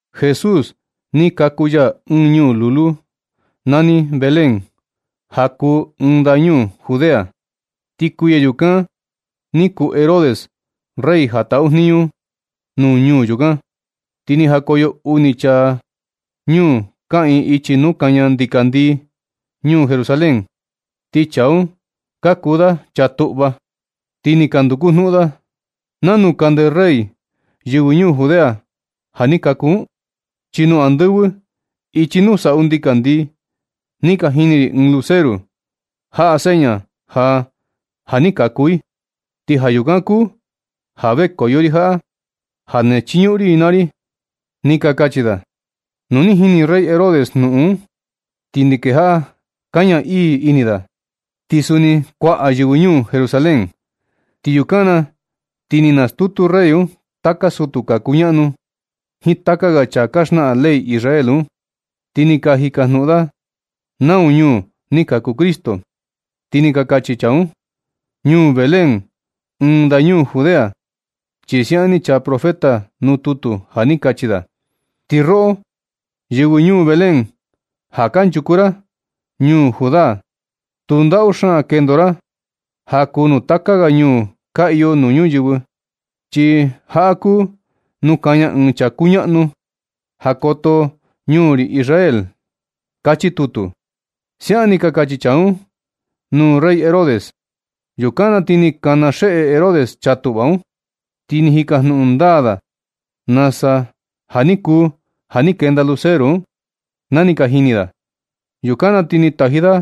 Jesús ni kaku ya ɨɨn ñuu lulu nani Belén, ja kuu ɨɨn ndañuu Judea. Ti kuiya yukan ni kuu Herodes rey ja taꞌu jniñu nuu ñuu yukan. Ti ni jakoyo uni chaa ñuu kaꞌiin ichi nuu kaña ndikandii ñuu Jerusalén, ti chaa un ka kuu da chaa tuꞌva. Ti ka nduku jnuꞌun da: ―¿Nanu kande rey yɨvɨ ñuu Judea ja ni kaku un? Chi nuu andɨvɨ ichi nuu saꞌu ndikandii ni ka jini ri ɨɨn luceru jaꞌa seña ja, ja ni kaku i. Ti ja yukan kuu ja vekoyo ri jaꞌa ja na chiñuꞌun ri i naa ri ―ni ka kachi da. Nu ni jini rey Herodes jnuꞌun un, ti ni kejaꞌa kaña ii ini da, ti suni kuaꞌa yɨvɨ ñuu Jerusalén. Ti yukan na ti ni nastutu rey un taka sutu ka kuñaꞌnu jiin taka ga chaa ka xnaꞌan ley Israel un, ti ni ka jikajnuꞌun da nau ñuu ni kaku Cristo. Ti ni ka kachi chaa un: ―Ñuu Belén, ɨɨn ndañuu Judea, chi siaꞌan ni chaa profeta nuu tutu ja ni kachi da: Ti roꞌo yɨvɨ ñuu Belén, ja kanchuku ra ñuu Judá, tu ndaꞌu xaan kendo ra ja kuu nuu taka ga ñuu ka iyo nuu ñuyɨvɨ, chi jaꞌa kuu nuu kaña ɨɨn chaa kuñaꞌnu, ja koto ñuu ri Israel. Kachi tutu. Siaꞌan ni ka kachi chaa un nuu rey Herodes. Yukan na ti ni kana xeꞌe Herodes chaa tuꞌva un, ti ni jikajnuꞌun ndaa da nasa ja ni kuu ja ni kenda luceru un, na ni ka jini da. Yukan na ti ni taji da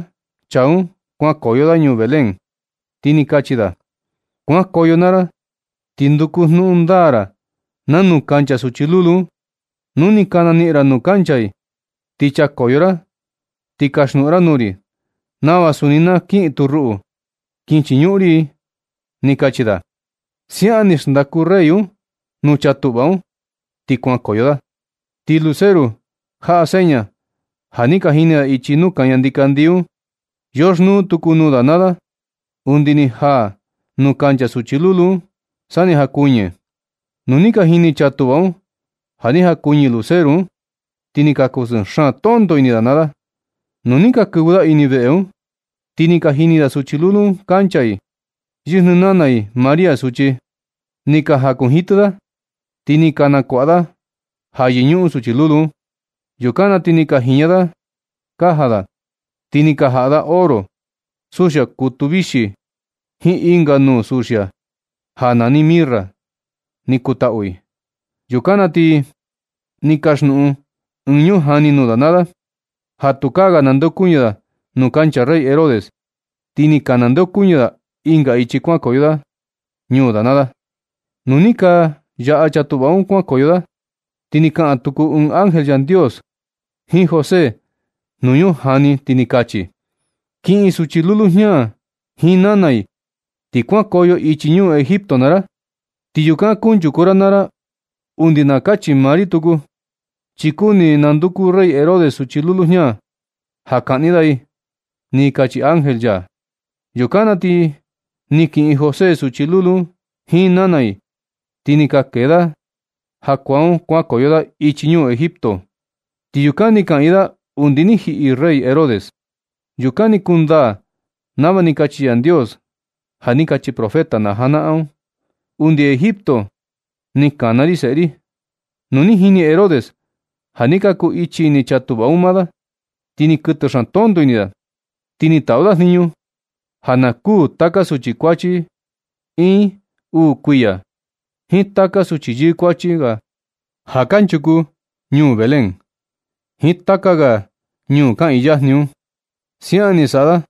chaa un kuankoyo da ñuu Belén, ti ni kachi da: ―Kuankoyo naa ra ti nduku jnuꞌun ndaa ra nanu kancha suchi lulu un. Nu ni ka naniꞌin ra nuu kancha i, ti chakoyo ra ti kasjnuꞌun ra nuu ri nava suni na kiꞌin tu ruꞌu, kin chiñuꞌun ri i ―ni kachi da. Siaꞌan ni xndaku rey un nuu chaa tuꞌva un, ti kuankoyo da. Ti luceru jaꞌa seña ja ni ka jini da ichi nuu kaña ndikandii un, yoxnuu tuku nuu da naa da undi ni jaa nuu kancha suchi lulu un sa ni jakuɨñɨ. Nu ni ka jini chaa tuꞌva un ja ni jakuɨñɨ luceru un, ti ni ka kusɨɨ xaan tonto ini da naa da. Nu ni ka kɨvɨ da ini veꞌe un, ti ni ka jini da suchi lulu un kancha i, yɨjnɨ nana i María suchi. Ni ka jakunjitɨ da, ti ni ka nakuaꞌa da ja yɨñuꞌun suchi lulu un. Yukan na ti ni ka jiña da kaja da, ti ni ka jaꞌa da oro, suxia kutu vixi jiin ɨnga nuu suxia (ja nani mirra), ni kutaꞌu i. Yukan na ti ni kasjnuꞌun ɨɨn ñujani nuu da naa da ja tukaa ga nandeokuñɨ da nuu kancha rey Herodes. Ti ni ka nandeokuñɨ da ɨnga ichi kuan nukoyo da ñuu da naa da. Nu ni ka yaꞌa chaa tuꞌva un kuankoyo da, ti ni kaꞌan tuku ɨɨn ángel Yandios jiin José nuu ñujani, ti ni kachi: ―Kiꞌin suchi lulu jña jiin nana i, ti kuankoyo ichi ñuu Egipto naa ra. Ti yukan kunchuku ra naa ra undi na kachi maa ri tuku, chi kuni nanduku rey Herodes suchi lulu jña ja kaꞌni da i ―ni kachi ángel ya. Yukan na ti ni kiꞌin José suchi lulu un jiin nana i, ti ni ka kee da jakuaa un kuankoyo da ichi ñuu Egipto. Ti yukan ni kaꞌiin da undi ni jiꞌi rey Herodes. Yukan ni kundaa nava ni kachi Yandios ja ni kachi profeta na janaꞌan un: “Undi Egipto ni kana ri seꞌe ri.” Nu ni jini Herodes ja ni ka kuu ichi ini chaa tuꞌva un maa da. Ti ni kɨtɨ xaan tonto ini da, ti ni taꞌu da jniñu ja na kuū taka suchi kuachi iin uu kuiya, jiin taka suchi yɨɨ kuachi ga ja kanchuku ñuu Belén, jiin taka ga ñuu kaꞌiin yajni un. Siaꞌan ni saꞌa da,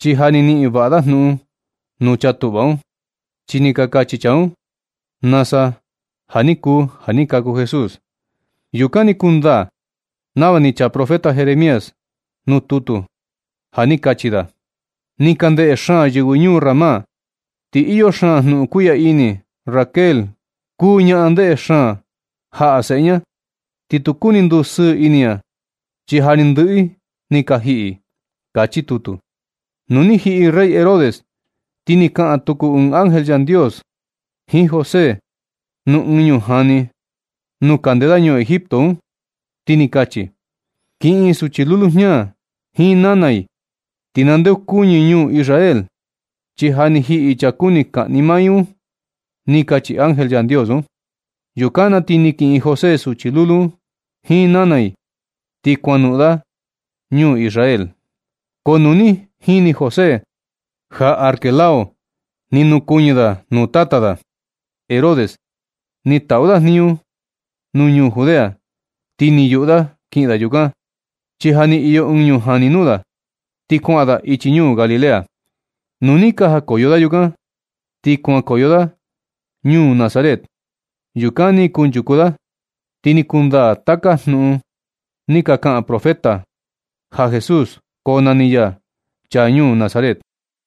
chi ja ni niꞌin vaꞌa da jnuꞌun nuu chaa tuꞌva un, chi ni ka kachi chaa un nasa ja ni kuu ja ni kaku Jesús. Yukan ni kundaa nava ni chaa profeta Jeremías nuu tutu ja ni kachi da: Ni ka ndeꞌe xaan yɨvɨ ñuu Ramá, ti iyo xaan jnuꞌun kuiꞌya ini. Raquel kuu ñaꞌan ndeꞌe xaan jaꞌa seꞌe ña, ti tu kuni ndusɨɨ ini ña, chi ja ni ndɨꞌɨ i ni ka jiꞌi. Kachi tutu. Nu ni jiꞌi rey Herodes, ti ni kaꞌan tuku ɨɨn ángel Yandios jiin José nuu ɨɨn ñujani nuu kande da ñuu Egipto un, ti ni kachi: ―Kiꞌin suchi lulu jña jiin nana i, ti nandeokuñɨ ñuu Israel, chi ja ni jiꞌi chaa kuni kaꞌni maa i un ―ni kachi ángel Yandios un. Yukan na ti ni kiꞌin José suchi lulu un jiin nana i, ti kuanoꞌon da ñuu Israel. Ko nu ni jini José ja Arquelao ni nukuɨñɨ da nuu tata da Herodes ti taꞌu da jniñu nuu ñuu Judea, ti ni yuꞌu da kiꞌin da yukan, chi ja ni iyo ɨɨn ñujani nuu da, ti kuaꞌan da ichi ñuu Galilea. Nu ni ka jakoyo da yukan, ti kuankoyo da ñuu Nazaret. Yukan ni kunchuku da. Ti ni kundaa taka jnuꞌun ni ka kaꞌan profeta ja Jesús konani ya, “chaa ñuu Nazaret.”